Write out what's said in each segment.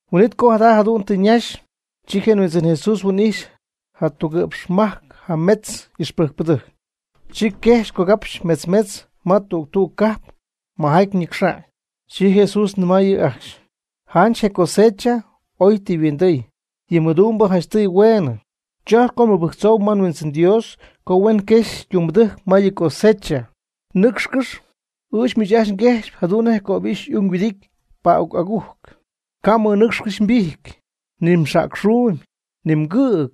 Huin'it co jada jadu'n tɨ ñaxy, chi je Huindzɨn Jesús huin'ijxy jatugɨ'pxmajc y'ixpɨjcpɨdɨjc, chi quejxɨ̈gy cogapxy metz metz ma tüg tüg cajp majaty ñɨcxa'ñ. Chi Jesús nɨmay yɨ' ajcxy: ―Janch je cosecha ooy tɨ yhuindɨɨy, yɨ mɨdumbɨ janchtɨɨy hueenɨ. Chojcpy co nbɨjctzóohuɨm ma nHuindzɨn Dios co huen quexy ytumbɨdɨjc ma yɨ cosecha. Nɨ́cxcɨx, ɨɨch miich ajcxy nguejxpy jadu'n nej cöbixy y'ung yhuɨdity pa'uc agujc. Ca' mmɨnɨcxcɨxy mbijty, ni mxäcxuumy, ni mgɨ̈g,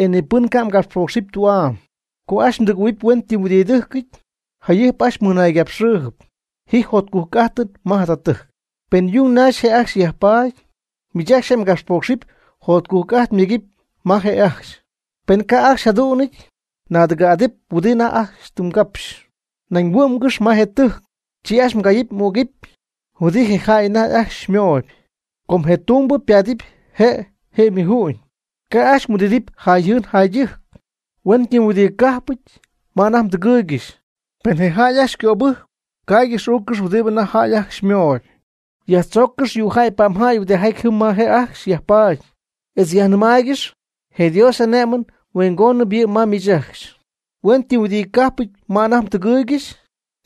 e ni pɨn ca' mgapxpócxcɨxɨpy tü'am. Co ajcxy mdɨgɨ̈huɨpy huenytɨmtitɨ́jcɨty, jayɨjp ajcxy mɨnáangɨxɨpy: “Ji jotcujc'ájtɨn ma jada tɨjc.” Pen yung naxy je' ajcxy yajpaady, miich ajcxy je mgapxpoocxɨn jotcujc'ajt myegɨpy ma je' ajcxy; pen ca' ajcxy yjadú'nɨty, naadɨgɨ̈'adɨp huɨdi anajty tɨ mgápxcɨxy. Nañ huɨ'mgɨx ma je tɨjc, chi ajcxy mgayɨpy m'ügɨpy huɨdi je jäy anajty ajcxy xymooyb, com je tumbɨ paatɨp je' je ymuju'ñ. Ca' ajcxy mhuɨdidɨpy jayjɨɨn jaydɨjc. Huenytɨmyhuɨdi cájpɨty ma anajty mdɨgɨɨygɨxy, pen je jäy ajcxy xycöbɨjcp, caaygɨx uuccɨx huɨdi anajty jäy ajcxy xymooyb. Yajtzóoccɨx yuujäy pa'mjäy huɨdijaty jɨm ma je' ajcxy yajpaady, etz yajnɨmaaygɨx: “Je Dios y'ané'mɨn huingónɨñ yɨ' ma miich ajcxy.” Huenytɨmyhuɨdicájpɨty ma anajty mdɨgɨɨygɨxy,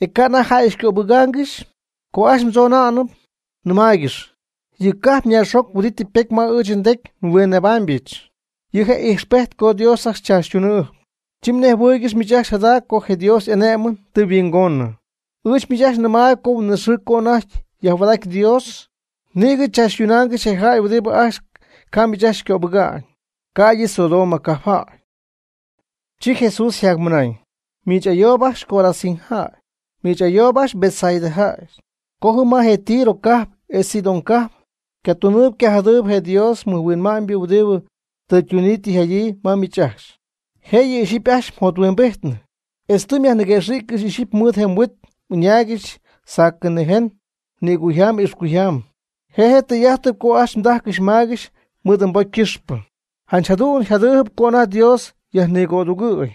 e ca' anajty jäy xycöbɨgaangɨxy, co ajcxy mdzonaanɨp, nɨmaaygɨx: “Yɨ mgajp naaxjoc huɨdi tɨ ypety ma ɨɨch ndecy nhuinnebáamyɨch, yɨ' je' ijxpejt co Dios ajcxy xychaachytunɨpy. Chi nejhuɨɨygɨx miich ajcxy jada co je Dios y'ané'mɨn tɨ ymɨhuingonɨ.” Ɨɨch miich ajcxy nɨmayb co huin'it xɨɨ co anajty yajhuaad'aty, Dios nïgɨ tzaachytunaangɨxy je jäy huɨdi ajcxy ca' miich ajcxy xycöbɨga'ñ, ca'ydɨ Sodoma cajpjäy. Chi Jesús yjacmɨnañ: ―¡Miich ayoob ajcxy Corozín jäy! ¡Miich ayoob ajcxy Betsaida jäy! Co jɨm ma je Tiro cajp etz Sidón cajp caytunɨ cayjajtɨ je Dios ymɨjhuinma'ñ huɨdi tɨ ytunyii tɨ yjadyii ma miich ajcxy, jécyɨp ixyipy ajcxy yjothuimbijtnɨ, etz tɨ yajniquëxɨ̈ccɨxy ixyipy mɨɨd je yhuit ɨñaaygɨxy sacɨ nïjen nïcuyjam ixcuyjam (je' je tɨy'ajt co ooy ytajcɨxy ymaygɨxy mɨɨd ypocy ycɨxpɨ). Janch jadu'n yjadɨpy co anajty Dios yajnigödugɨ̈y,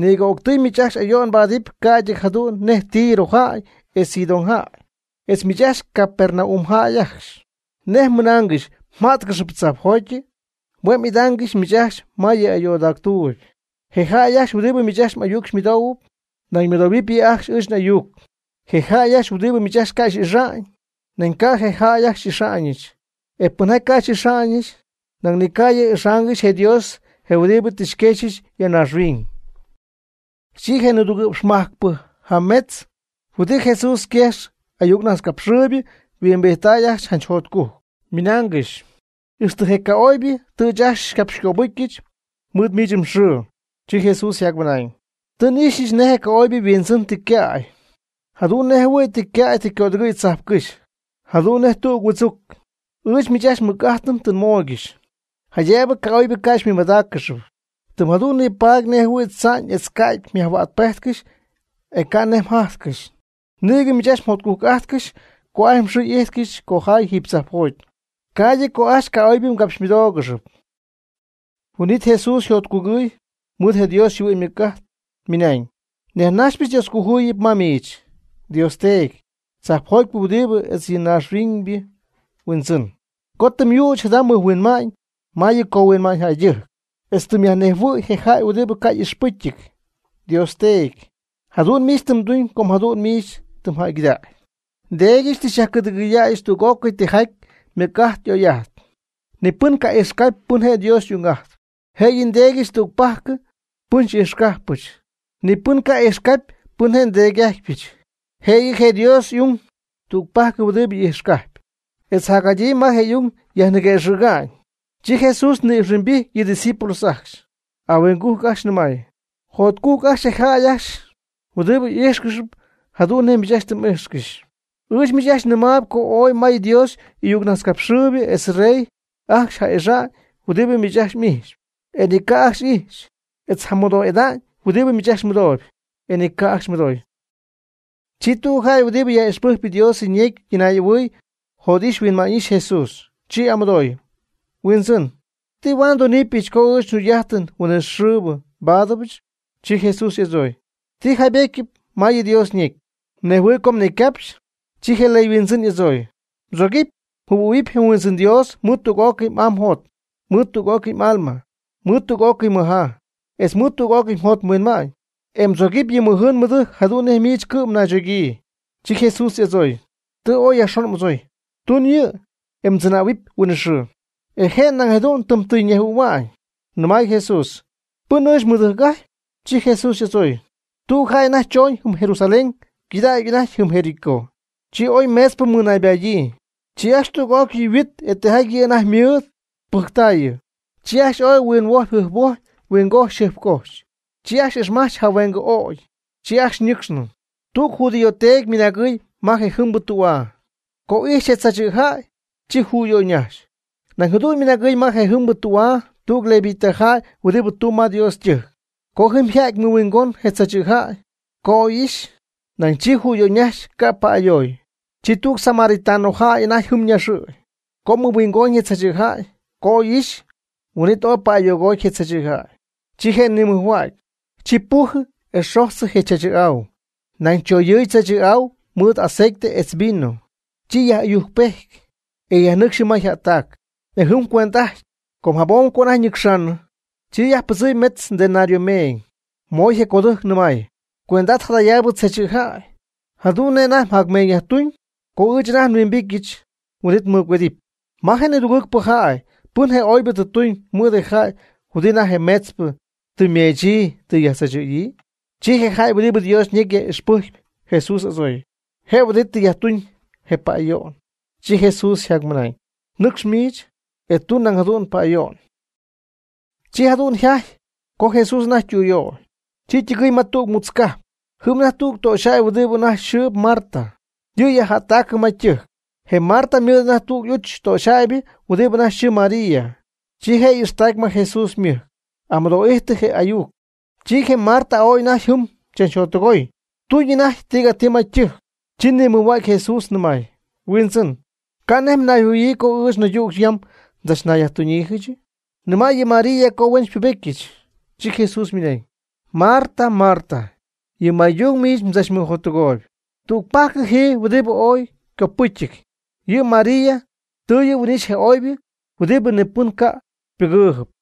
nïgɨ o'ctɨy miich ajcxy ayo'n mbaadɨɨyb ca'ydɨ jadu'n nej Tiro jäy etz Sidón jäy. E miich ajcxy Capernaum jäy ajcxy, ¿nej mmɨnaangɨxy mjätcɨxɨpy tzajpjotyɨ? Hue' m'ɨdaaccɨxyp miich ajcxy ma yɨ ayoodactuuby. Je jäy ajcxy huɨdi miich ajcxy m'ayuc xymɨdoohuɨp, nañ xymɨdoohuɨɨb yɨ' ajcxy ɨɨch n'ayuc. Je jäy ajcxy huɨdibɨ miich ajcxy ca' xy'ixa'ñ, nañ ca' je' ajcxy xy'ixa'ñɨch; e pɨnjaty ca' xy'ixa'ñɨch, nañ ni ca' yɨ' ixaangɨxy je Dios je huɨdi tɨ xyquexyɨch ya naaxhuiñ. Chi je nidugɨ'pxmajcpɨ huɨdi Jesús yquejx ayuccapxhuäcxpɨ yhuimbijttay ajcxy janch jotcujc, ymɨnaangɨxy: ―Ixtɨ je ca'oybɨ tɨ ɨɨch ajcxy xycapxycöbɨ́jccɨxy mɨɨd miich mxɨɨ. Chi Jesús ymɨnañ: ―Tɨ n'ixyɨch nej je ca'oybɨ yhuindzɨn tɨ ycäy, jadu'n nej jɨhuɨ̈y tɨ ycäy tɨ ycödɨgɨɨy tzajpcɨ́xy, jadu'n nej tüg huɨdzuc. Ɨɨch miich ajcxy mɨc'ájtɨn tɨ nmooygɨxy, jaydëbɨ ca'oybɨ ca' xymɨmadáaccɨxɨpy, tɨm jadu'n nipaady nej jɨhuɨ̈y tza'ñ etz ca'ty myajhuäcpéjtcɨxy e ca' nej mjájtcɨxy. Nïgɨ miich ajcxy jotcujc'ájtcɨx co ajcxy mxɨɨ y'íjtcɨxy cojay jiiby tzajpjoty, ca'ydɨ co ajcxy ca'oybɨ xycapxymɨdoogɨxy. Huin'it Jesús yjotcugɨɨy mɨɨd je Dios yjɨhuɨ'ñ ymɨc'ajt, ymɨnañ: ―Nyajnajxypɨch Dioscojuyip ma miich, Dios Teedy, tzajpjotypɨ Huindzɨn etz je naaxhuiñybɨ Huindzɨn, co tɨ myüch jada mɨjhuinma'ñ ma yɨ cohuinma'ñ jäydɨjc, etz tɨ myajnejhuɨ̈y je jäy huɨdi ca' y'ixpɨ́cyɨty. Dios Teedy, jadu'n miich tɨ mduñ com jadu'n miich tɨ mjäygɨdacy. Ndéedyɨch tɨ xyajcɨ̈dɨgɨydäyɨch tüg'ócɨy tijaty mɨc'ajt oy'ajt. Ni pɨn ca' ijxcajp pɨn je' Dios y'ung'ajtpy, jëyɨ nDéedyɨch tügpajcɨ pɨn xy'ijxcajpɨch. Ni pɨn ca' ijxcapy pɨn je' nDéedy'ájtypɨch, jëyɨ je Dios ung tügpajcɨ huɨdi ijxcajp, etz jacjadyii ma je ung yajniguëxɨ̈ga'ñ. Chi Jesús ni'ijxhuimbijty yɨ' ydiscípulos ajcxy, ahuingujc ajcxy nɨmay: ―Jotcujc ajcxy je jäy ajcxy huɨdi ijxcɨxp jadu'n nej miich ajcxy tɨ m'íjxcɨxy. Ɨɨch miich ajcxy nɨmayb co ooy may Dios y'ayucnajtzcapxɨɨyb etz rey ajcxy ja'ixa'ñ huɨdibɨ miich ajcxy m'ijxpy, e ni ca' ajcxy ixy; etz jamɨdoo'ida'ñ huɨdi miich ajcxy mɨdooyb, e ni ca' ajcxy mɨdooy. Chi tüg jäy huɨdi yaj'ixpɨjcp Dios ñecy ytɨnaay'ahuɨɨy jot'ixy huinma'ñ'ixy Jesús, chi y'amɨdooy: ―Huindzɨn, ¿ti huaad ndunɨpɨch co ɨɨch jugy'ajtɨn huinɨxɨɨbɨ nbáadɨbɨch? Chi Jesús y'adzooy: ―¿Ti jaybétyɨp ma yɨ Dios ñecy? ¿Nej mhuinjɨhuɨ̈y co mnecycapxy? Chi je ley huindzɨn y'adzooy: ―Mdzogɨpy mjɨhuɨ̈huɨpy mHuindzɨn Dios mɨɨd tüg'ócɨy m'aa mjot, mɨɨd tüg'ócɨy m'alma, mɨɨd tüg'ócɨy mmɨjaa, etz mɨɨd tüg'ócɨy mjot mhuinma'ñ, e mdzogɨpy yɨ mɨjɨɨn mɨdɨjc jadu'n nej miich cɨ'm naychogyii. Chi Jesús y'adzooy: ―Tɨ ooy yajxon m'adzooy. Tun yɨ', e mdzɨnähuɨp huinɨxɨɨ. E je' nañ jadu'n tɨm tɨy ñejhuɨ̈hua'ñ, nɨmay Jesús: ―¿Pɨn ɨɨch nmɨdɨjc'ajtpy? Chi Jesús y'adzooy: ―Tüg jäy choñ jɨm Jerusalén ycɨdägy anajty jɨm Jericó, chi oy meetzpɨ mɨnaybadyii. Chi ajcxy tüg'ócɨy yhuit e tijaty yɨ' anajty ymɨɨd pɨjctaayɨ. Chi ajcxy ooy huinhuojpy jɨjphuojpy huingojxy jɨjpcojxy, chi ajcxy ixmach jahueengɨ ögy, chi ajcxy ñɨcxnɨ. Tüg judío teedy ymɨnagɨɨy ma je jɨmbɨ tü'aa. Co y'ijxy je tzaachɨ̈jäy, chi jüyöyñajxy. Nañ jadu'n ymɨnagɨɨy ma je jɨmbɨ tü'aa tüg levita jäy huɨdi tuumb ma Dios ytɨjc, co jɨm yjäty mɨhuingon je tzaachɨ̈jäy, co oy ixy, nañ chi jüyöyñajxy (ca' pa'ayooy). Chi tüg samaritano jäy anajty jɨm naxɨ̈y, co mɨhuingoñ je tzaachɨ̈jäy, co oy ixy, huin'it ooy pa'ayogooty je tzaachɨ̈jäy. Chi je' nimɨjhuägy, chi pujɨ e xojtzɨ je chaachɨ̈'au, nañ tzoyɨɨyɨ chaachɨ̈'au mɨɨd aceite etz vino. Chi yaj'ɨyujcpety, e yajnɨcxy jɨm ma yjättac, e jɨm cuend'ajty. Com jabom co anajty ñɨcxaanɨ, chi yajpɨdzɨmy mejtz denario meeñ, moy je codɨjc nɨmay: “Cuend'at jadayaabɨ tzaachɨ̈jäy, jadu'n nej anajty mjacmeeñyajtuñ, co ɨɨch anajty nhuimbityɨch huin'it nmɨgüedɨpy.” ¿Ma je nidugɨɨgpɨ jäy pɨn je oybɨ tɨ tuñ mɨɨd je jäy huɨdi anajty je meetzpɨ tɨ ymeechyii tɨ yajtzaachɨ̈yii? Chi je jäy huɨdi Dios ñecy yaj'ijxpɨjcp Jesús y'adzooy: ―Je huɨdi tɨ yajtuñ je pa'ayo'ñ. Chi Jesús ymɨnañ: ―Nɨcx miich, e tun nañ jadu'n pa'ayo'n. Chi jadu'n yjajty co Jesús anajty ytüyöy, chi ytɨgɨɨy ma tüg mutz cajp. Jɨm anajty tüg töxyjäy huɨdi anajty yxɨɨ Marta, yɨ' yajjättacɨ ma ytɨjc. Je Marta ymɨɨd anajty tüg y'uch töxyjäybɨ huɨdi anajty yxɨɨ María, chi je' y'ixtacy ma Jesús ymɨjc, amɨdoo'ijtɨ je' y'ayuc. Chi je Marta ooy anajty jɨm chachjottɨgoy tuñ anajty tigatii ma ytɨjc, chi nimɨjhua'cy je Jesús nɨmay: ―Huindzɨn, ¿ca' nej mnayjɨhuɨ̈yiijɨ co ɨɨch naydüg yam tzach nayyajtuñyiijɨchɨ? Nɨma' yɨ María co huen xypubétyɨch. Chi Jesús ymɨnañ: ―Marta, Marta, yɨ maytung miich mdzachmɨjottɨgooyb. Tügpajc ji, huɨdibɨ ooy ycopɨ́cyɨp. Yɨ María tɨ yɨ' huin'ixy je oybɨ huɨdi ni pɨn ca' ypɨgɨɨyb.